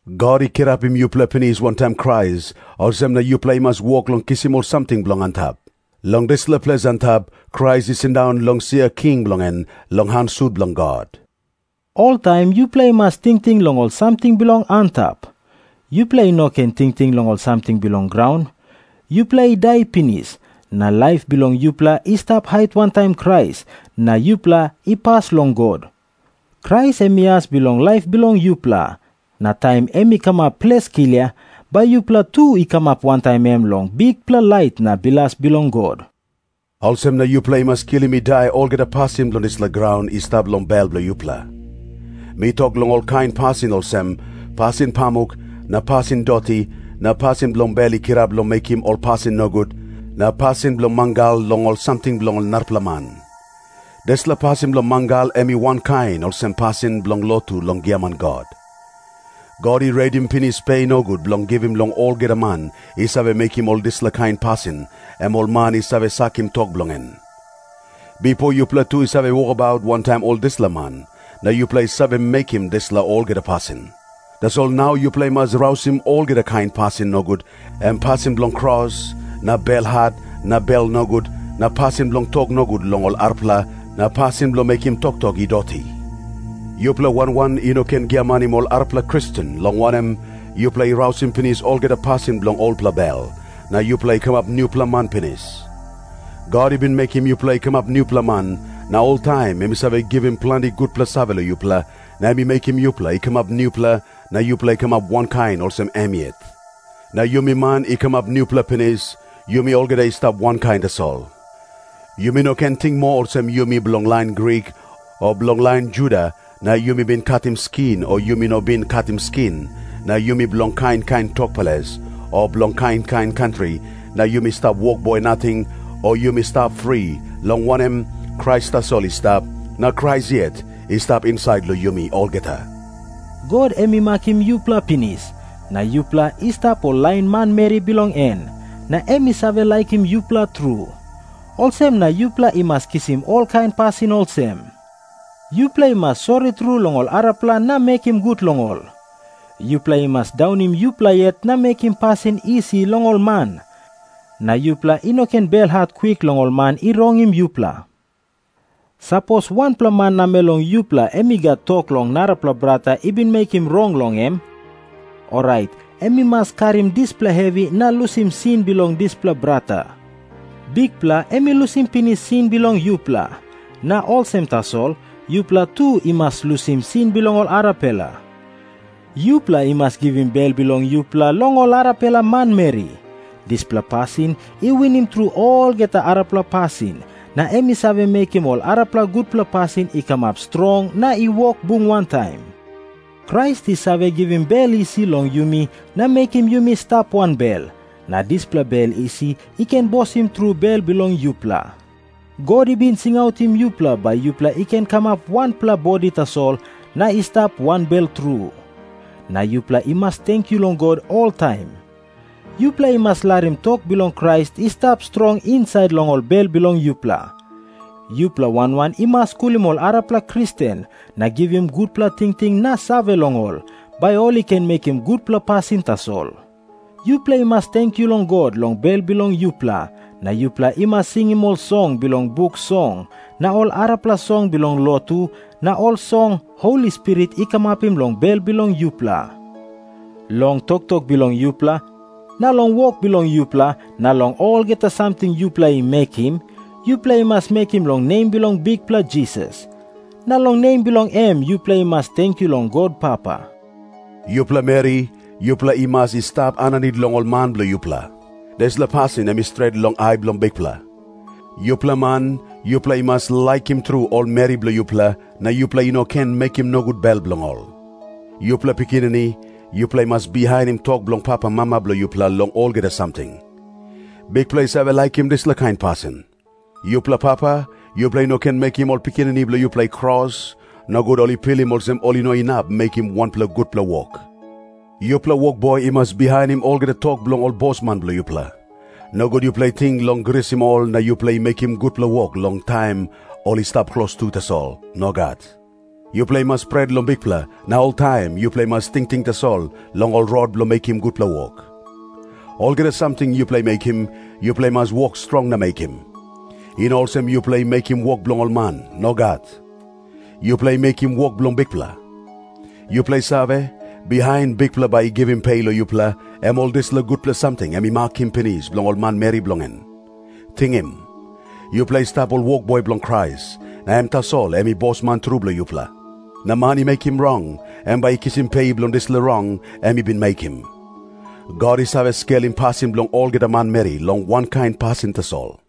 God i kirapim yupela pinis wantaim Krais, olsem na yupela i mas wok long kisim ol samting bilong antap. Long dispela ples antap, Krais i sindaun long sia king bilong en long han sut bilong God. Oltaim yupela i mas tingting long ol samting bilong antap. Yupela i no ken tingting long ol samting bilong graun. Yupela i dai pinis, na laip bilong yupela i stap hait wantaim Krais na yupela i pas long God. Krais em i as bilong laip bilong yupela. Na taim em i kamap ples klia, bai yupela tu i kamap wantaim em long bikpela lait na bilas bilong God. Olsem na yupela i mas kilim i dai olgeta pasin bilong dispela graun i stap long bel bilong yupela. Mi tok long olkain pasin olsem, pasin pamuk na pasin doti, na pasin bilong bel i kirap long mekim ol pasin nogut, na pasin bilong mangal long ol samting bilong narapela man. Dispela pasin bilong mangal em i wankain olsem pasin bilong lotu long giaman god. God i redim pinis pe nogut bilong givim long olgeta man i save mekim ol dispela kain pasin, em ol man i save sakim tok bilong en. Bipo yupela tu i save wokabaut wantaim ol dispela man, na yupela i save mekim dispela olgeta pasin. Tasol nau yupela i mas rausim olgeta kain pasin nogut, em pasin bilong kros na belhat na bel nogut, na pasin bilong tok nogut long ol arapela na pasin bilong mekim toktok i doti. Yupela wan wan i no ken giamanim ol arapela Kristen, long wanem, yupela i rausim pinis olgeta pasin bilong olpela bel, na yupela i kamap nupela man pinis. God i bin mekim yupela i kamap nupela man, na oltaim em i save givim planti gutpela save long yupela, na em i mekim yupela i kamap nupela na yupela i kamap wankain olsem em yet. Na yumi man i kamap nupela pinis, yumi olgeta i stap wankain tasol. Yumi no ken ting moa olsem yumi bilong lain Grik o bilong lain Juda, na yumi bin katim skin o yumi no bin katim skin, na yumi bilong kain kain tok ples o bilong kain kain kantri, na yumi stap wokboi nating o yumi stap fri, long wanem, Krais tasol i stap, na Krais yet i stap insait long yumi olgeta. God em i makim yupela pinis, na yupela i stap ol lain manmeri bilong en, na em i save laikim yupela tru. Olsem na yupela i mas kisim olkain pasin olsem. Yupela i mas sori tru long ol arapela na mekim gut long ol. Yupela i mas daunim yupela yet na mekim pasin isi long ol man, na yupela i no ken belhat kwik long ol man i rongim yupela. Sapos wanpela man namel long yupela em i gat tok long narapela brata i bin mekim rong long em, orait em i mas karim dispela hevi na lusim sin bilong dispela brata. Bikpela em i lusim pinis sin bilong yupela, na olsem tasol yupela tu i mas lusim sin bilong ol arapela. Yupela i mas givim bel bilong yupela long ol arapela manmeri. Dispela pasin i winim tru olgeta arapela pasin, na em i save mekim ol arapela gutpela pasin i kamap strong na i wok bung wantaim. Krais i save givim bel isi long yumi na mekim yumi i stap wanbel, na dispela bel isi i ken bosim tru bel bilong yupela. God i bin singautim yupela bai yupela i ken kamap wanpela bodi tasol na i stap wanbel tru. Na yupela i mas tenkyu long God oltaim. Yupela i mas larim tok bilong Krais i stap strong insait long bel bilong yupela. Yupela wan wan i mas skulim ol arapela Kristen na givim gutpela tingting na save long ol, bai ol i ken mekim gutpela pasin tasol. Yupela i mas tenkyu long God long bel bilong yupela, na yupela i mas singim ol song bilong Buk Song na ol arapela song bilong lotu na ol song Holi Spirit i kamapim long bel bilong yupela. Long toktok bilong yupela na long wok bilong yupela na long olgeta samting yupela i mekim, yupela i mas mekim long nem bilong Bikpela Jisas. Na long nem bilong em yupela i mas tenkyu long God Papa. Yupela meri, yupela i mas i stap aninit long ol man bilong yupela. Dispela pasin em i stret long ai bilong Bikpela. Yupela man, yupela i mas laikim tru ol meri bilong yupela, na yupela i no ken mekim nogut bel bilong ol. Yupela pikinini, yupela i mas bihainim tok bilong papamama bilong yupela long olgeta samting. Bikpela i save laikim dispela kain pasin. Yupela papa, yupela i no ken mekim ol pikinini bilong yupela i kros, nogut ol i pilim olsem ol i no inap mekim wanpela gutpela wok. Yupela wokboi i mas bihainim olgeta tok bilong ol bosman bilong yupela. Nogut yupela i ting long grisim ol na yupela i mekim gutpela wok long taim ol i stap klostu tasol. Nogat. Yupela i mas pret long Bikpela, na oltaim yupela i mas tingting tasol long ol rot bilong mekim gutpela wok. Olgeta samting yupela i mekim, yupela i mas wok strong na mekim. I no olsem yupela i mekim wok bilong ol man. Nogat. Yupela i mekim wok bilong Bikpela. Yupela i save, bihain Bikpela bai i givim pe long yupela, em ol dispela gutpela samting em i makim pinis bilong ol manmeri bilong en. Tingim. Yupela i stap ol wokboi bilong Krais, na em tasol em i Bosman tru bilong yupela. Na man i mekim rong, em bai i kisim pe bilong dispela rong em i bin mekim. God i save skelim pasin bilong olgeta manmeri long wankain pasin tasol.